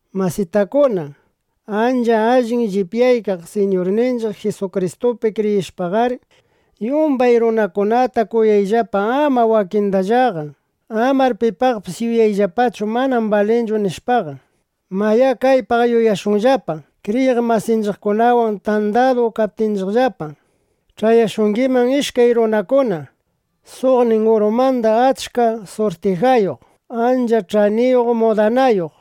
Masitakuna, ancha allin llipyaykaq Siñurninchiq Jisukristupi kriyishpaqar, yumbay runakunata kuyayllapa, ama wakindallaqa. Amar pipaqpis yuyayllapachu: Manam balinchu, nishpaqa. Mayá, kaypaq yuyashunllapa: Kriyiq masinchiqkunawan tandadu kaptikillapa, ch'ayashungiman ishkay runakuna. Suqnin urumanda achka surtijayuq, ancha ch'aniyuq mudanayuq.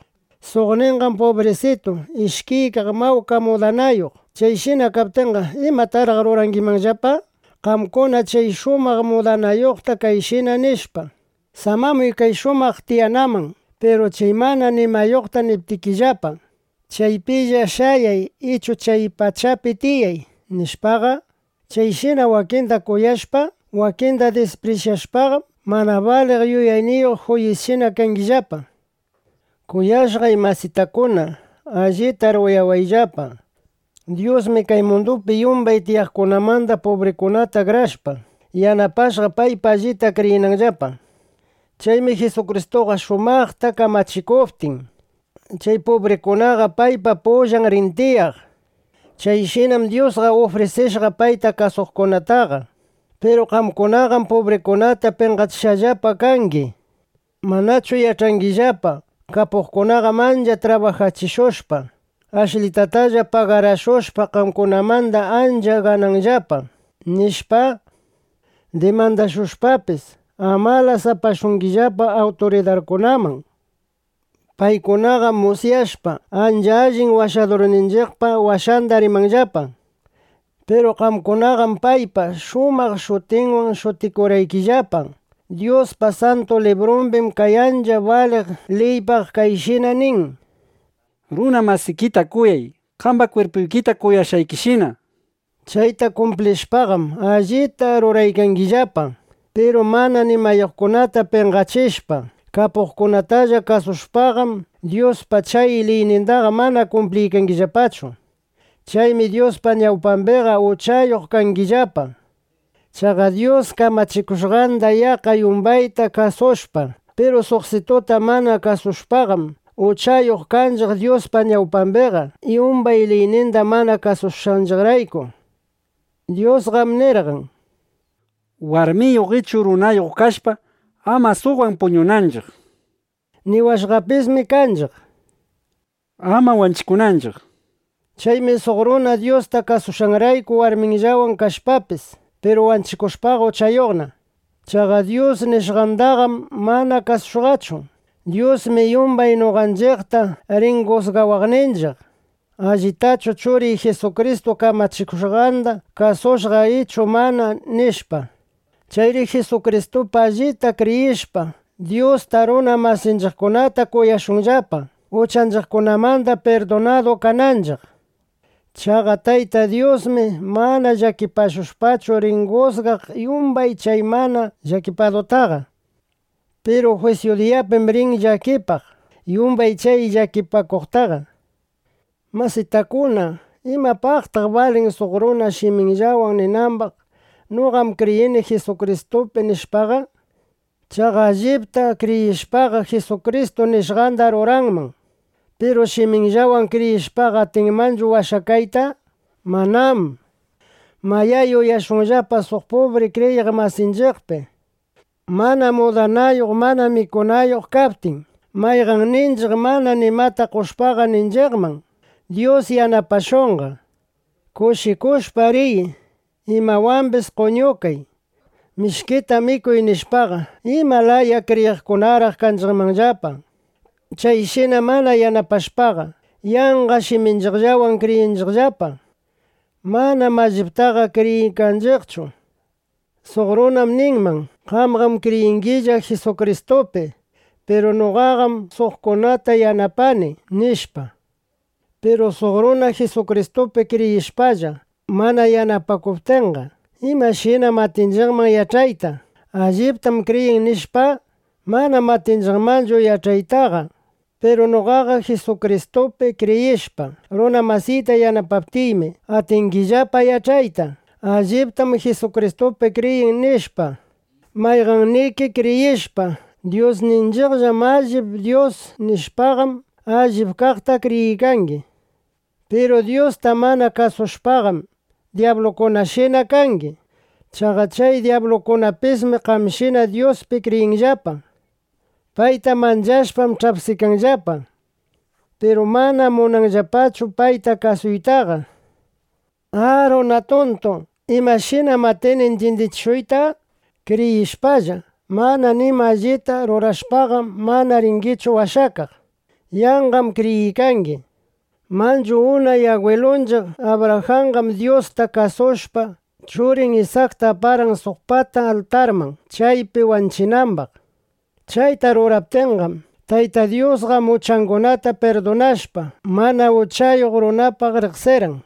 Suqninqam pubrisitu, ishkiykaq mawka mudanayuq. Chayshina kaptinqa, ¿imataraq rurangimanllapa? Qamkuna chay shumaq mudakushqata kayshina nishpa: “Samamuy kay shumaq tiyanaman”, piru chay mana nimayuqta niptikillapa: “Chaypilla shayay ichu chay pachapi tiyay”, nishpaqa, chayshina wakinda kuyashpa, wakinda disprisyashpaqam, mana baliq yuyayniyuq juyisshina kangillapa. Kuyashqay masitakuna, allitar uyawayllapa. Dyusmi kay mundupi yumbay tiyaqkunamanda pubrikunata akrashpa, yanapashqa, paypi allita kriyinanllapa. Chaymi Jisukristu shumaqta kamachikuptin, chay pubrikunaqa paypa pullanna rin tiyaq. Chayshinam Dyus ufrisishqa payta kuyaqkunataqa. Piru qamkunaqam pubrikunata penqachishqallapa kangi. ¿Manachu yach'angillapa: Kapuqkunaqam ancha trabajachishushpa, ashlitatalla pagarashushpa, qamkunamanda ancha gananllapa, nishpa? Dimandashushpapis, amalas apashungillapa awturidarkunaman. Paykunaqam musyashpa, ancha allin Washadurninchiqpa washanda rimanllapa, ¿manachu? Piru qamkunaqam paypa shumaq shutinwan shutikurqaykillapa. Dyuspa Santu Librumbim kay ancha baliq liypaq kayshina nin: “Runa masikita kuyay, qamba kwirpuykita kuyashqaykishina”, nishpa. Chayta kumplishpaqam, allita ruraykangillapa. Piru mana nimayuqkunata penqachishpa, kapuqkunatalla kuyashpaqam, Dyuspa chay liynindaqa mana kumpliykangillapachu. Chaymi Dyuspa ñawpambiqa uchayuq kangillapa. Chaqa Dyus kamachikushqanda yaqqa yumbayta kasushpa, piru suqsituta mana kasushpaqam, uchayuqna kanchiq Dyuspa ñawpambiqa, yumbay liyninda mana kasushqanchiqrayku. Dyusqam nirqan, warmiyuq ichu runayuq kashpa, ama suqwan puñunanchiq. Niwashqapismi kanchiq, ama wanchikunanchiq. Chaymi suq runa Dyusta kasunanrayku warminwanlla kashpapis, piru wanchikushpaqa, uchayuqna. Chaqa Dyus nishqandaqam mana kasushqachu. Dyusmi yumbay noqanchiqta rin jusgawaqninchiq: “¿Allitachu Churiy Jisukristu kamachikushqanda kasushqa ichu mana?” nishpa. (Chayri Jisukristupi allipta kriyishpa, Dyusta, runa masinchiqkunata kuyashunllapa, uchanchiqmanda pirdunadu kananchiq.) Chaqa Tayta Dyusmi mana llakipashpachu rin jusgaq yumbay chay mana llakipakuqtaqa. Piru jwisyu diyapim rin llakipaq yumbay chay llakipakuqtaqa. Masitakuna, ¿imapaqtaq balin suq runa shiminwanlla ninambaq: “Noqam kriyini Jisukristupi”, nishpaqa? Chaqa allipta kriyishpaqa, Jisukristu nishqanda ruranman. Piru shiminwanlla kriyishpaqa, ¿atinmanchu washakayta? Manám. Mayá, yuyashunllapa suq pubri kriyiq masinchiqpi. Mana mudanayuq, mana mikunayuq kaptin, mayqanninchiq mana nimata qoshpaqa, ninchiqman: “Dyus yanapashunqa. Kushikushpa riy. Imawambis qoñukay. Mishkita mikuy”, nishpaqa, ¿ima laya kriyiqkunaraq kanchiqmanllapa? Chayshina mana yanapashpaqa, yanqa shiminchiqwanlla kriyiykanchiqllapa. Manam alliptaqa kriyiykanchiqchu. Suq runam ninman: “Qamqam kriyingilla Jisukristupi; piru noqaqam suqkunata yanapani”, nishpa. Piru suq runa Jisukristupi kriyishpalla, mana yanapakuptinqa, ¿imashinam atinchiqman yach'ayta: “Alliptam kriyin”, nishpa? Manam atinchiqmanchu yach'aytaqa. Piru noqaqa Jisukristupi kriyishpa, runa masiyta yanapaptiymi, atingillapa yach'ayta: “Alliptam Jisukristupi kriyin”, nishpa. Mayqanniki kriyishpa: Dyusninchiqllam allip Dyus, nishpaqam, allip kaqta kriyiykangi. Piru Dyusta mana kasushpaqam, dyablukunashina kangi. Chaqa chay dyablukunapismi qamshina Dyuspi kriyinllapa. Payta manchashpam ch'apsikanllapa. Piru manam munanllapachu payta kasuytaqa. ¡A, runa tuntu! ¿Imashinam atini intyindichishuyta? Kriyishpalla, mana nima allita rurashpaqam, mana ringichu washakaq. Yanqam kriyiykangi. Manchu unay agwilunchiq Abrajanqam Dyusta kasushpa, churin Isakta aparqan suq pata altarman, chaypi wanchinambaq. Chayta ruraptinmi, Tayta Dyusqa uchangunata pirdunashpa, mana uchayuq runapaqna riqsirqan.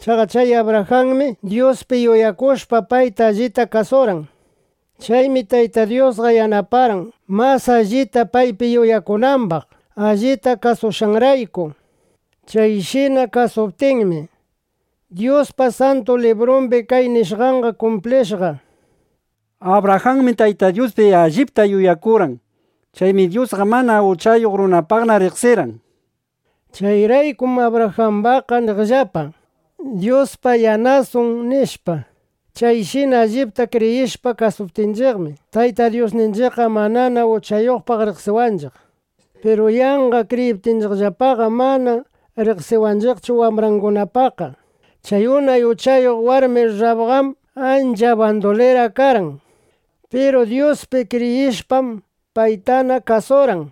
Chaqa chay Abrajanmi, Dyuspi yuyakushpa, payta allita kasurqan. Chaymi Tayta Dyusqa yanaparqan, mas allita paypi yuyakunambaq, allita kasushqanrayku. Chayshina kasuptinmi, Dyuspa Santu Librumbi kay nishqanqa kumplishqa: “Abrajanmi Tayta Dyuspi allipta yuyakurqan. Chaymi Dyusqa mana uchayuq runapaqna riqsirqan”, nishpa. Chayraykum Abrajambaqqa niqllapa: “Dyuspa yanasun (yanasan)”, nishpa. Chayshina allipta kriyishpa kasuptinchiqmi, Tayta Dyusninchiqqa manana uchayuqpaq riqsiwanchiq. Piru yanqa kriyiptinchiqllaqam, mana riqsiwanchiqchu wambrangunapaqqa. Chay unay uchayuq warmi Rrabqam ancha bandulira karqan. Piru Dyuspi kriyishpam, paytana kasurqan.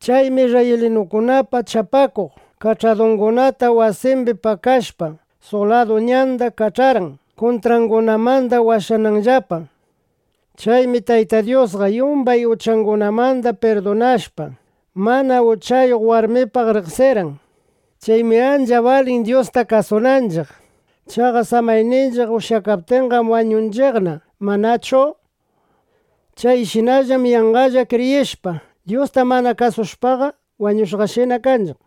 Chaymi isrraylinukunapa chapakuq kach'adungunata wasimbi pakashpa, suq ladu ñandana kach'arqan, kuntrangunamanda washakananllapa. Chaymi Tayta Dyusqa yumbay uchangunamanda pirdunashpa, mana uchayuq warmipaqna riqsirqan. Chaymi ancha balin, Dyusta kasunanchiq. Chaqa samayninchiq ushyakaptinqam, wañunchiqna, ¿manachu? Chayshinallam yanqalla kriyishpa, Dyusta mana kasushpaqa, wañushqashina kanchiq.